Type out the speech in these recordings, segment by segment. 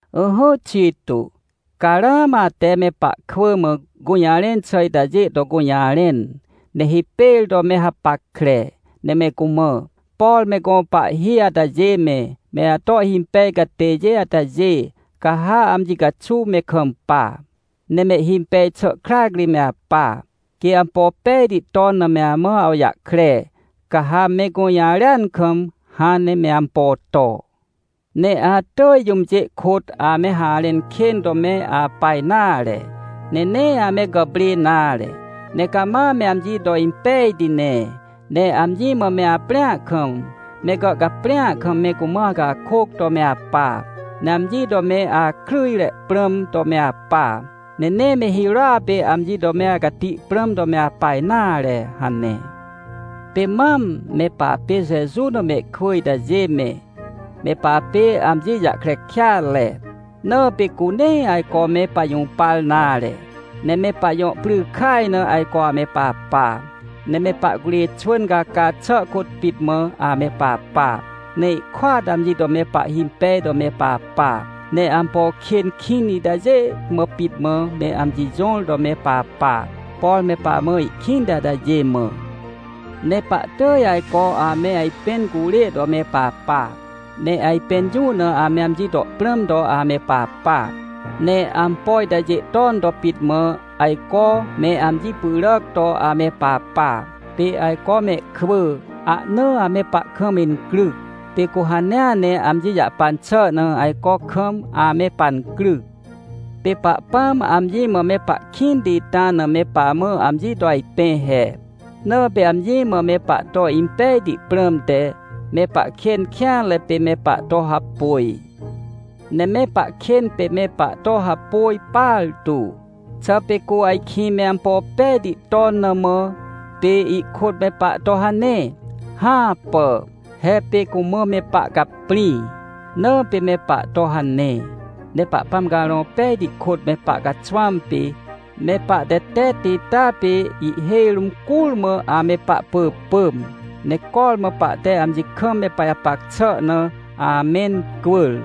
Ỹhỹ Tito, ca ramã ate me pahkwỳ mã gũjarẽn xà itajê to gũjarẽn, ne hipêr to me hapackre, ne me cumã: — Por me gõ pahhi atajê me, me ato ihhimpej catêjê atajê, ca ha amji caxuw me kampa, ne mehhimpej xà krac ri me apa. Quê ampo pejti ton na me amã awjahkre, ca ha me gũjarêan kam, hãn ne me ampo to. Ne atỳj jũmjê kôt ame harẽn kên to me apa nare, ne nee ame gàprê nare, ne cama me amji to impejti ne. Ne amji mã me aprĩa kam, me gàhcaprĩa kam me cumã acakôc to me apa, ne amji to me akryjre prãm to me apa, ne nee me hirôa pê amji to me acati prãm to me apa nare — hane. Pê mam me papê Jeju na mehkwỳ itajê me, me papê amji jahkre kêatre, na pê cu nee ajco me pajũpar nare, ne me pajõ pry kaj na ajco ame papa. Ne me pahcurê xwỳn caca xà kôt pit mã ame papa, ne ihkôat amji to me pahhimpej to me papa. Ne ampo kên kĩn itajê mã pit mã me amji jõr to me papa, por me pamã ihkĩnti atajê mã. Ne pahtỳj ajco ame ajpẽn curê to me papa, ne ajpẽn jũ na ame amji to prãm to ame papa. Ne ampo itajê ton to pit mã, ajco me amji pyràc to ame papa. Pê ajco mehkwỳ, ahna ame pahkam incryc, pê cu hanea ne amji jahpan xà na ajco kam ame pancryc. Pê Pahpãm amji mã me pahkĩnti ita na me pamã amji to ajpẽ he. Na pê amji mã me pahto impejti prãmte, me pahkên kêanre pê me pahto hapôj. Ne me pahkên pê me pahto hapôj partu. Xà pê cu ajkĩ me ampo pejti to na mã, pê ihkôt me pahto hane? Hãpà! He pê cumã me pahcaprĩ, na pê me pahto hane. Ne Pahpãm Carõ Pejti kôt me pahcaxwãm pê, me pahtetetti ita pê ihhêj rũm curmã ame pahpỳpỳm, ne cormã pahte amji kam me pajapac xà na amencwỳr.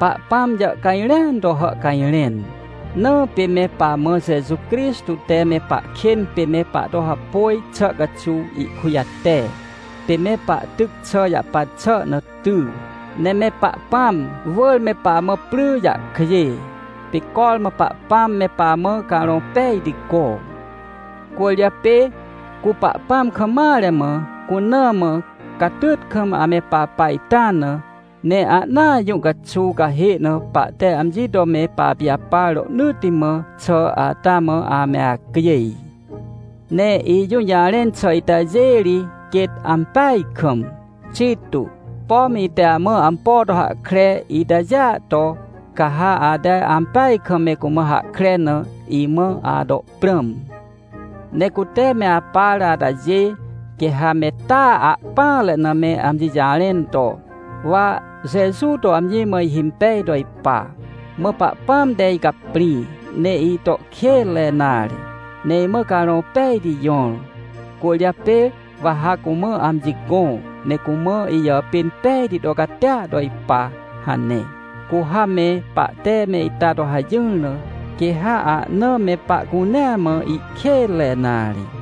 Pahpãm jàhcajrẽan to hàhcajrẽn, na pê me pamã Jeju Crixtô te me pahkên pê me pahto hapôj xà caxuw ihkujate. Pê me pahtyc xà jahpan xà na ty, ne me Pahpãm wỳr me pamã pry jahkjê, pê cormã Pahpãm me pamã Carõ Pejti gõ. Cwỳrjapê cu Pahpãm kam mare mã, cuna mã, catyt kam ame papa ita na, ne ahnaa jũ caxuw cahê na pahte amji to me papijapar rohnỳtti mã xà ata mã ame acjêj. Ne ijũjarẽn xà itajê ri quêt ampeaj kam. Tito, pom ite amã ampo to hahkre itajêa to, ca ha ate ampeaj kam me cumã hahkre na, imã ato prãm. Ne cute me apar atajê, quê ha me taa ahpỹanre na me amji jarẽn to: — Wa Jeju to amji mã ihimpej to ipa, mã Pahpãm te icaprĩ, ne ito kênre nare, ne imã Carõ Pejti jõr, cwỳrjapê wa ha cumã amji gõ, ne cumã ijàpên pejti to catia to ipa — hane. Cu ha me pahte me ita to hajỹr na, quê ha ahna me pahcunea mã ihkênre nare.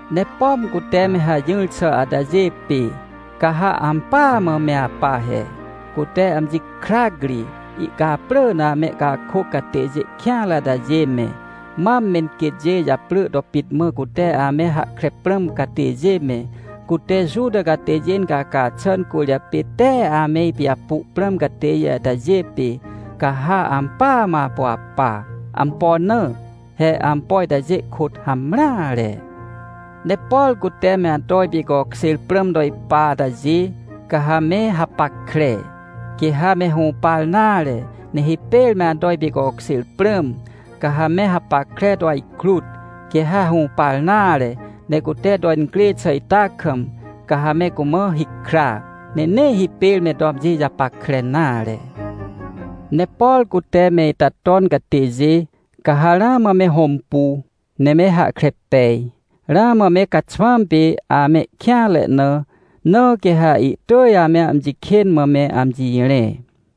Ne pom cute me hajỹr xà atajê pê, ca ha ampỳa mã me apa he. Cute amji krac ri ihcaprỳ na amehcakôc catêjê kêanre atajê me, mam menquêtjê japrỳ to pit mã cute ame hahkre prãm catêjê me, cute Juta catêjê incaca xà cwỳrjapê tee ame ipijapu prãm catêjê atajê pê, ca ha ampỳa mã apu apa. Ampo na? He ampo itajê kôt hamreare. Ne por cute me ato ipicokjêr prãm to ipa atajê, ca ha me hapackre. Quê ha me hũpar nare, ne hipêr me ato ipicokjêr prãm, ca ha me hapackre to ajkrut. Quê ha hũpar nare, ne cute to incrê xà ita kam, ca ha me cumã hikra, ne nee hipêr me to amji japackre nare. Ne por cute me ita ton catêjê, ca ha ramã me hõmpu, ne me hahkre pej, ramã me caxwãm pê amehkêanre na, na quê ha ihtỳj ame amji kên mã me amji rẽ.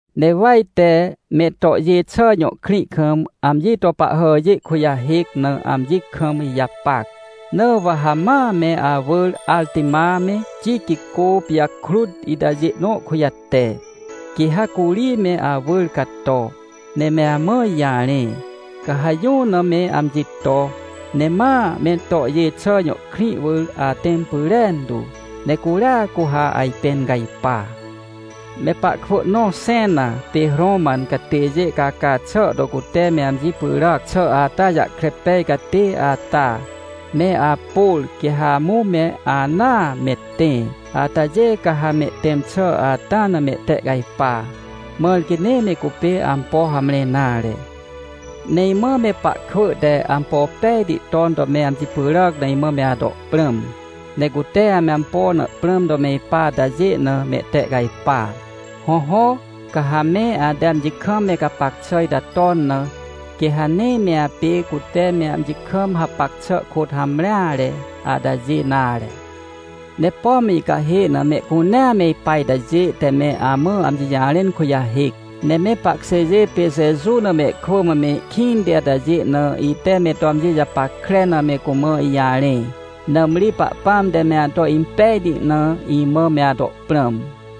Ne wa ite Metohjêxà jõ krĩ kam amji to pahhàjê kujahêc na amji kam ijapac. Na wa ha ma me awỳr Artima me, Tiquicô pijakrut itajê nõ kujate. Quê ha curi me awỳr cato, ne me amã ijarẽ, ca ha jũ na me amji to, ne ma Metohjêxà jõ krĩ wỳr atẽm pyrentu. Ne curia cu ha ajpẽn cajpa. Me pahkwỳ nõ Xena pê Roman catêjê caca xà to cute me amji pyràc xà ata jahkre pej catê ata, me Apôr, quê ha amũ me anaa me tẽ. Atajê ca ha mehtẽm xà ata na mehtehcajpa, mãr quê nee me cupê ampo hamre nare. Ne imã me pahkwỳ te ampo pejti ton to me amji pyràc na imã me ato prãm. Ne cute ame ampo na prãm to me ipa atajê na mehtehcajpa. Hõhõ, ca ha me ate amji kam me gapac xà ita ton na, quê ha nee me apê cute me amji kam hapac xà kôt hamreare atajê nare. Ne pom icahê na mehcunea me ipa itajê te me amã amji jarẽn kujahêc, ne me pahkjêjê pê Jeju na mehkwỳ mã me ikĩnti atajê na ite me to amji japackre na me cumã ijarẽ. Nãmri Pahpãm te me ato impejti na imã me ato prãm.